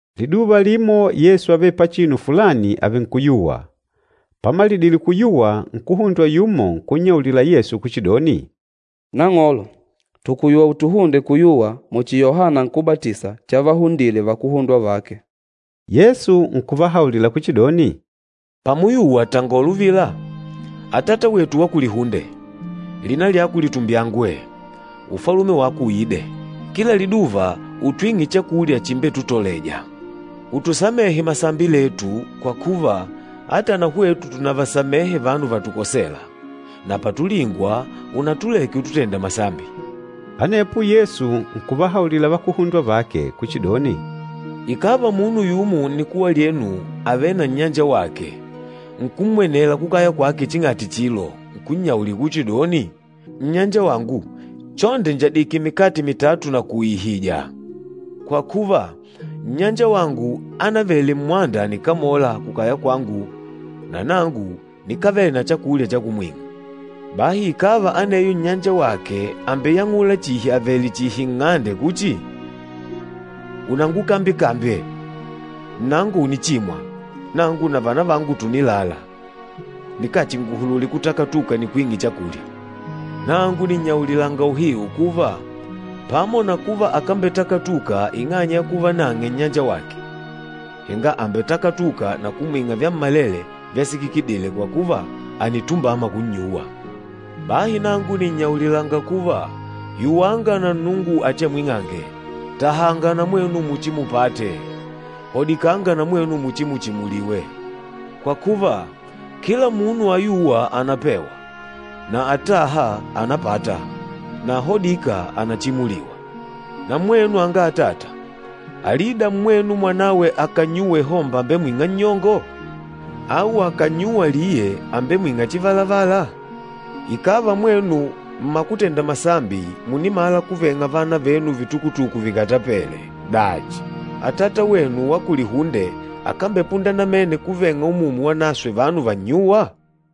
Liduva limo Yesu ávele pachinu fulani àvenkuyuwa. Pamalidile kuyuwa nkuhundwa yumo nkunnyaulila Yesu kuchidoni, “Nang'olo, tùkuyuwa utuhunde kuyuwa muchi Yohana Nkúbatisa chavahundile vakuhundwa vake.” Yesu nkuvahaulila kuchidoni, “Pamuyuwa tangola uvila, ‘Atata wetu wa kulihunde, lina lyako litumbyangwe, Ufalume wako uide. Kila liduva utwing'e chakulya chimbetutoleja. Utusamehe masambi letu, kwa kuva, ata na hwetu tùnavasamehe vanu vatukosêla, na patulingwa, unatuleke ututenda masambi.’” Anepo Yesu nkuvahaulila vakuhundwa vake kuchidoni, “Ikàva munu yumo nnikuwa lyenu àvele na nnyanjawake, nkummwenela kukaya kwake ching'ati chilo nkunnyaulila kuchidoni, ‘Nnyanjawangu, chonde njadike mikate mitatu nakuiihija, kwa kuva, nnyanjawangu ánavele mmwanda ànikamola kukaya kwangu na nangu nikávele na chakulya cha kumwing'a.’ Bahi ikàva aneyo nnyanjawake àmbeyang'ula chihi avèlè chihi nng'ande kuchi, ‘Unangukambye-kambye! Nnango ùnichimwa, nangu na vanavangu tùnilala, nikachinguhulule kutakatuka nikwing'e chakulya.’ Nangu nìnnyaulilanga uhiu kuva, pamo na kuva akambetakatuka ing'anya ya kuva nang'e nnyanjawake, henga àmbetakatuka na kumwing'a vyammalele vyasikikidile kwa kuva, ànitumbama kunnyuwa. Bahi nangu nìnnyaulilanga kuva, yuwanga na Nnungu achiamwing'ange, tahanga na mwenu muchimupate, hodikanga na mwenu muchimuchimuliwe. Kwa kuva, kila munu ayûwa ànapewa, na atâha ànapata, na ahodîka ànachimuliwa. Na mwenu anga atata, alida mmwenu mwanawe akànnyuwa ihomba àmbemwing'a nnyongo? Au akànnyuwa liye, àmbemwing'a chivalavala? Ikàva mwenu mmakutenda masambi, mùnimala kuveng'a vana venu vitukutuku vikatapele, dachi, Atata wenu wa kulihunde akambepunda namene kuveng'a Umumu Wanaswe vanu vannyûwa?”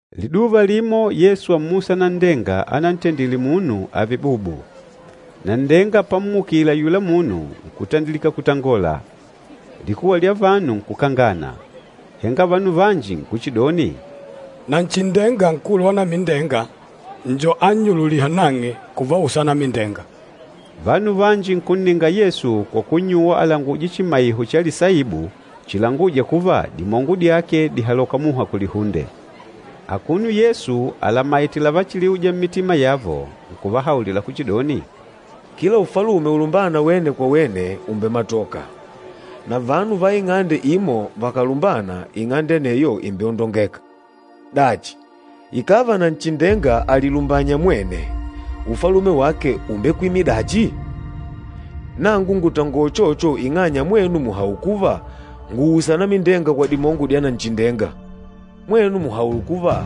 Liduva limo Yesu ámmusa nanndenga anantendile munu ààve bubu. Nanndenga pammukile ayula munu nkutandilika kutangola, likuwa lya vanu nkukangana. Henga vanu vanji nkuchidoni, “Nanchindenga, nkulu wa anamindenga njo annyululîha nang'e kuvausa anamindenga.” Vanu vanji nkunninga Yesu kwa kunnyuwa alanguje chimaiho cha lisaibu chilangûja kuva dimongo dyake dìhaloka muha kulihunde. Akuno Yesu alamaìtè lavachiliuja mmitima yavo, nkuvahaulila kuchidoni, “Kila ufalume ulumbâna wene kwa wene ùmbematoka, na vanu va ing'ande imo vakàlumbana, ing'ande aneyo ìmbeondongeka. Dachi, ikàva Nanchindenga àlilumbanya mwene, ufalume wake ùmbekwimila dachi? Nangu ngùtangola uchocho ing'anya mwenu mùhaula kuva ngùusa anamindenga kwa dimongo dya Nanchindenga. Mwenu mùhaula kuva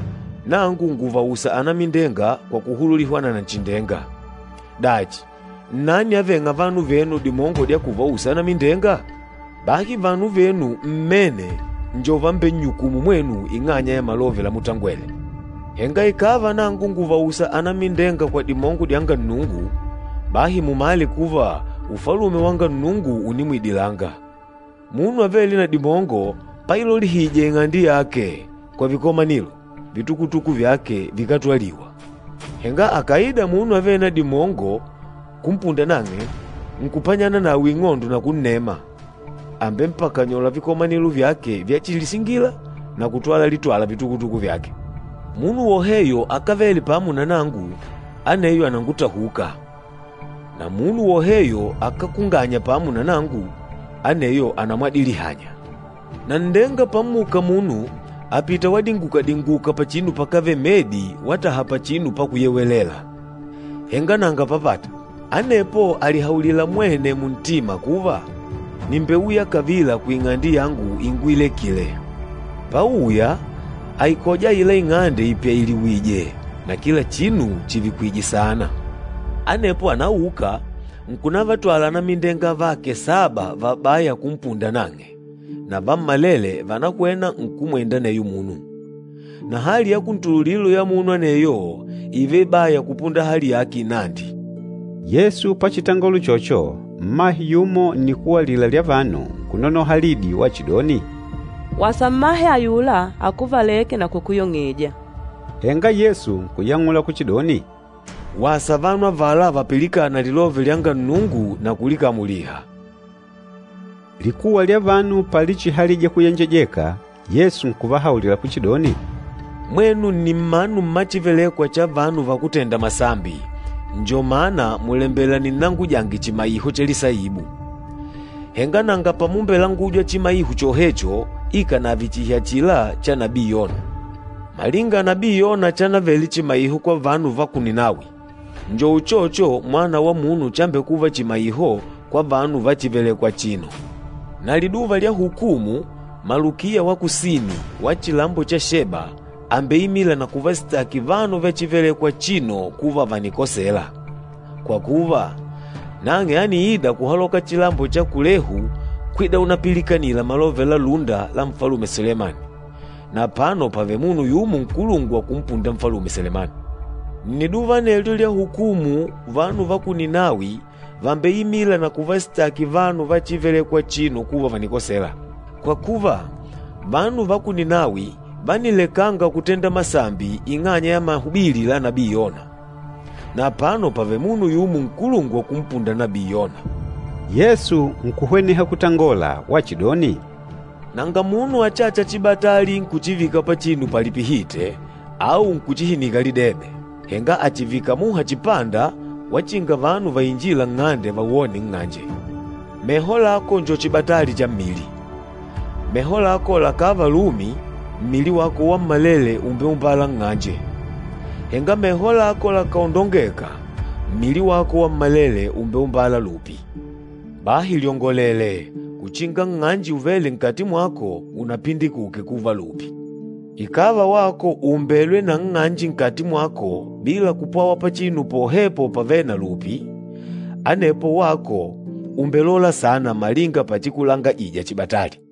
nangu ngùvausa anamindenga kwa kuhululihwa na Nanchindenga, dachi, nnani avêng'a vanu venu dimongo dya kuvausa anamindenga? Bahi vanu venu mmene njo vambennyukûmu mwenu ing'anya ya malove lamutangwele. Henga ikàva nangu ngùvausa anamindenga kwa dimongo dyanga Nnungu, bahi mumale kuva Ufalume wanga Nnungu ùnimwidilanga. Munu avêle na dimongo pailolihija ing'ande yake kwa vikomanilo, vitukutuku vyake vikátwaliwa. Henga akàida munu avêle na dimongo kumpunda nang'e nkupanyana nawe ing'ondo na kunnema, àmbempakanyola vikomanilo vyake vyachilisingila na kutwala litwala vitukutuku vyake. Munu woheyo akávele pamo na nangu, aneyo ànangutahuka, na munu woheyo akákunganya pamo na nangu, aneyo ànamwadilihanya.” “Nanndenga pammuka munu, àpita wadinguka-dinguka pachinu pakávele medi wataha pachinu pakuyewelela, henga nanga papata. Anepo àlihaulila mwene muntima kuva, ‘Nìmbeuya kavila kuing'ande yangu inguilekile.’ Páùyà, àikoja aila ing'ande ipyailiwìjè na kila chinu chivikwìjè saana. Anepo ànauka, nkunavatwala anamindenga avake saba vabaya kumpunda nang'e, na vammalele vànahwena nkumwenda aneyo munu. Na hali ya kuntululilo ya munu aneyo ììva ibaya kupunda hali yake inandi.” Yesu pachitangola uchocho, mmahe yumo nnikuwa alila lya vanu, nkunonoha lidi wachidoni, “Wasa mmahe ayula akuvalêke na kukuyong'eja!” Henga Yesu nkuyang'ula kuchidoni, “Wasa vanu avala vapilikâna lilove lyanga Nnungu na kulikamuliha.” Likuwa lya vanu palichihalija kuyenjejeka, Yesu nkuvahaulila kuchidoni, “Mwenu nni mmanu mma chívelèkwà cha vanu vakútenda masambi, njo mana mùlembela ninnangujange chimaiho cha lisaibu, henga nanga pamumbelangujwa chimaiho chohecho ikànave chihi achila cha nabii Yona. Malinga nabii Yona chanavele chimaiho kwa vanu va ku Ninawi, njo uchocho Mwana wa Munu chambekuva chimaiho kwa vanu va chívelèkwà achino. Na liduva lya hukumu malukiya wa kusini, wa chilambo cha Sheba àmbeimila na kuvasitaki vanu va chívelèkwà achino kuva vànikosela. Kwa kuva, nang'e ániida kuhaloka chilambo cha kulehu kwida unapilikanila malove la lúnda la Nfalume Selemani, na apano pàvele munu yumo nkulungwa kumpunda Nfalume Selemani. Nniduva anelyo lya hukumu vanu va ku Ninawi vàmbeimila na kuvasitaki vanu va chívelèkwà achino kuva vànikosela. Kwa kuva, vanu va ku Ninawi vánilekanga kutenda masambi ing'anya ya mahubili la nabii Yona, na apano pàvele munu yumo nkulungwa kumpunda nabii Yona!” Yesu nkuhweneha kutangola wachidoni, “Nanga munu achâcha chibatali nkuchivika pachinu palipihite, au nkuchihinika lidebe, henga àchivika muha chipanda wachinga vanu vainjîla nng'ande vawone nng'anje. Meho lako njo chibatali cha mmili. Meho lako lakàva lumi, mmili wako wammalele ùmbeumbala nng'anje. Henga meho lako lakàondongeka, mmili wako wammalele ùmbeumbala lupi. Bahi lyongolele, uchinga nng'anje uvêle nkati mwako unapindikuke kuva lupi. Ikàva wako ùumbelwe na nng'anje nkati mwako bila kupwawa pachinu pohepo pavêle na lupi, anepo wako ùmbelola saana malinga pachikulangajija chibatali.”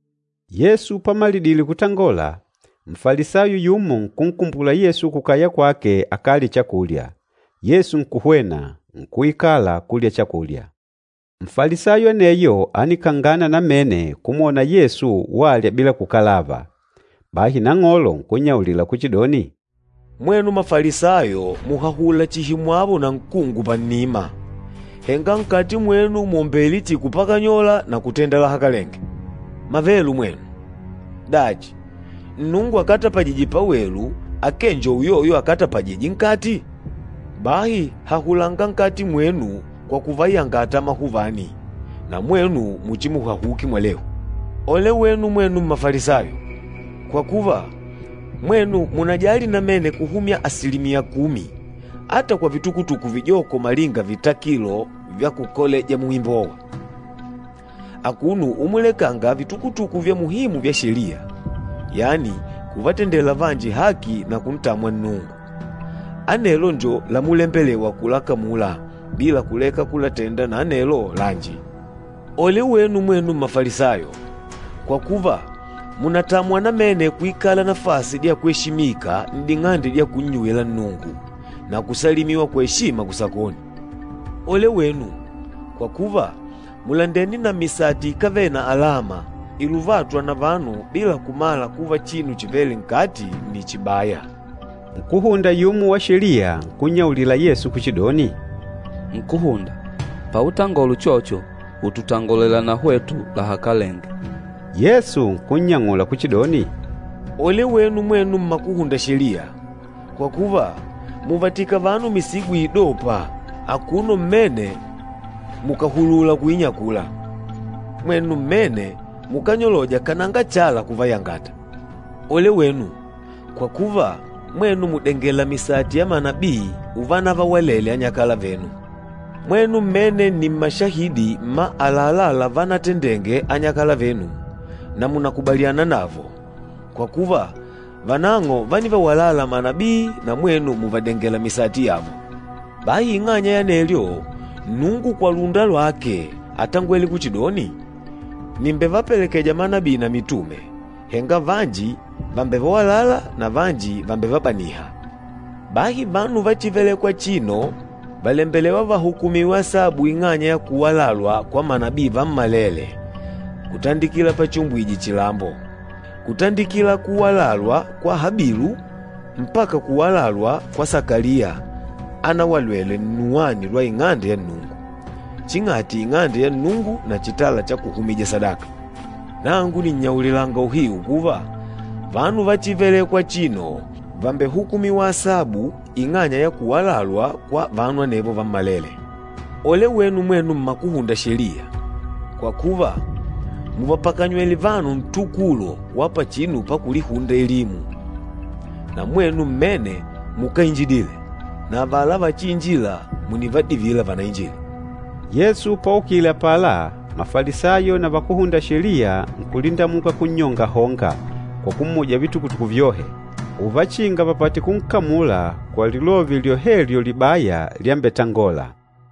Yesu pamalidile kutangola, Nfalisayo yumo nkunkumbula Yesu kukaya kwake akalye chakulya. Yesu nkuhwena, nkuikala kulya chakulya. Nfalisayo aneyo ánikangana namene kumwona Yesu walya bila kukalava. Bahi Nang'olo nkunnyaulila kuchidoni, “Mwenu Mafalisayo mùhahula chihi mwawo na nkungu pannima, henga nkati mwenu mwòmbele chihi kupakanyola na kutenda lahakalenge. Mavelu mwenu! Dachi, Nnungu akatapajîje pawelu akee njo uyoyo akatapajîje nkati? Bahi hahulanga nkati mwenu kwa kuvayangata amahuvani, na mwenu muchimuhahuke mwalehu. Ole wenu mwenu Mmafalisayo! Kwa kuva, mwenu mùnajali namene kuhumya asilimiya kumi ata kwa vitukutuku vijoko malinga vitakilo vya kukoleja muimbowa, akuno umulekanga vitukutuku vya muhimu vya Sheliya, yani kuvatendela vanji haki na kuntamwa Nnungu. Anelo njo lamulembelewa kulakamula bila kuleka kulatenda na anelo lanji. Ole wenu mwenu Mmafalisayo! Kwa kuva, mùnatamwa namene kuikala nafasi dya kweshimika n'ding'ande dya kunnyuwila Nnungu na kusalimiwa kwa eshima kusakoni. Ole wenu! Kwa kuva, mùlandene na misati ikávele na alama, iluvâtwa na vanu bila kumala kuva chinu chivêle nkati nni chibaya.” Nkúhunda yumo wa Sheliya nkunnyaulila Yesu kuchidoni, “Nkúhunda, pautangola uchocho, ututangolela na hwetu lahakalenge.” Yesu nkunnyang'ula kuchidoni, “Ole wenu mwenu mmakuhunda Sheliya! Kwa kuva, mùvatika vanu misigo iidôpa, akuno mmene mukàhulula kuinyakula. Mwenu mmene mukányoloja kananga chala kuvayangata. Ole wenu! Kwa kuva, mwenu mùdengela misati ya manabii uvanavawalele anyakala venu. Mwenu mmene nni mmashahidi mma àlalá lavanatendenge anyakala venu na mùnakubaliana navo, kwa kuva vanang'o vánivawalala manabii na mwenu mùvadengela misati yavo. Bahi ing'anya ya anelyo, Nnungu kwa lúnda lwake átangwele kuchidoni, ‘Nìmbevapelekeja manabii na mitume, henga vanji vàmbevawalala na vanji vàmbevabaniha.’ Bahi vanu va chívelèkwà achino vàlembelewa vahukumiwe asabu ing'anya ya kuwalalwa kwa manabii vammalele kutandikila pachiumbwije chilambo, kutandikila kuwalalwa kwa Habilu mpaka kuwalalwa kwa Sakaliya anawalelwe nnuwani lwa Ing'ande ya Nnungu, ching'ati Ing'ande ya Nnungu na chitala cha kuhumija sadaka. Nangu nìnnyaulilanga uhiu kuva, vanu va chívelèkwà achino vàmbehukumiwa asabu ing'anya ya kuwalalwa kwa vanu anevo vammalele. Ole wenu mwenu Mmakuhunda Sheliya! Kwa kuva, mùvapakanywele vanu ntukulo wa pachinu pakulihunda elimu. Na mwenu mmene mukáinjidile, na avala vachiinjîla mùnivadivila vanainjile.” Yesu paukile apala, Mafalisayo na Vakúhunda Sheliya nkulindamuka kunnyongahonga kwa kumuja vitukutuku vyohe, uvachinga vapate kunkamula kwa lilove lyohelyo libaya lyambetangola.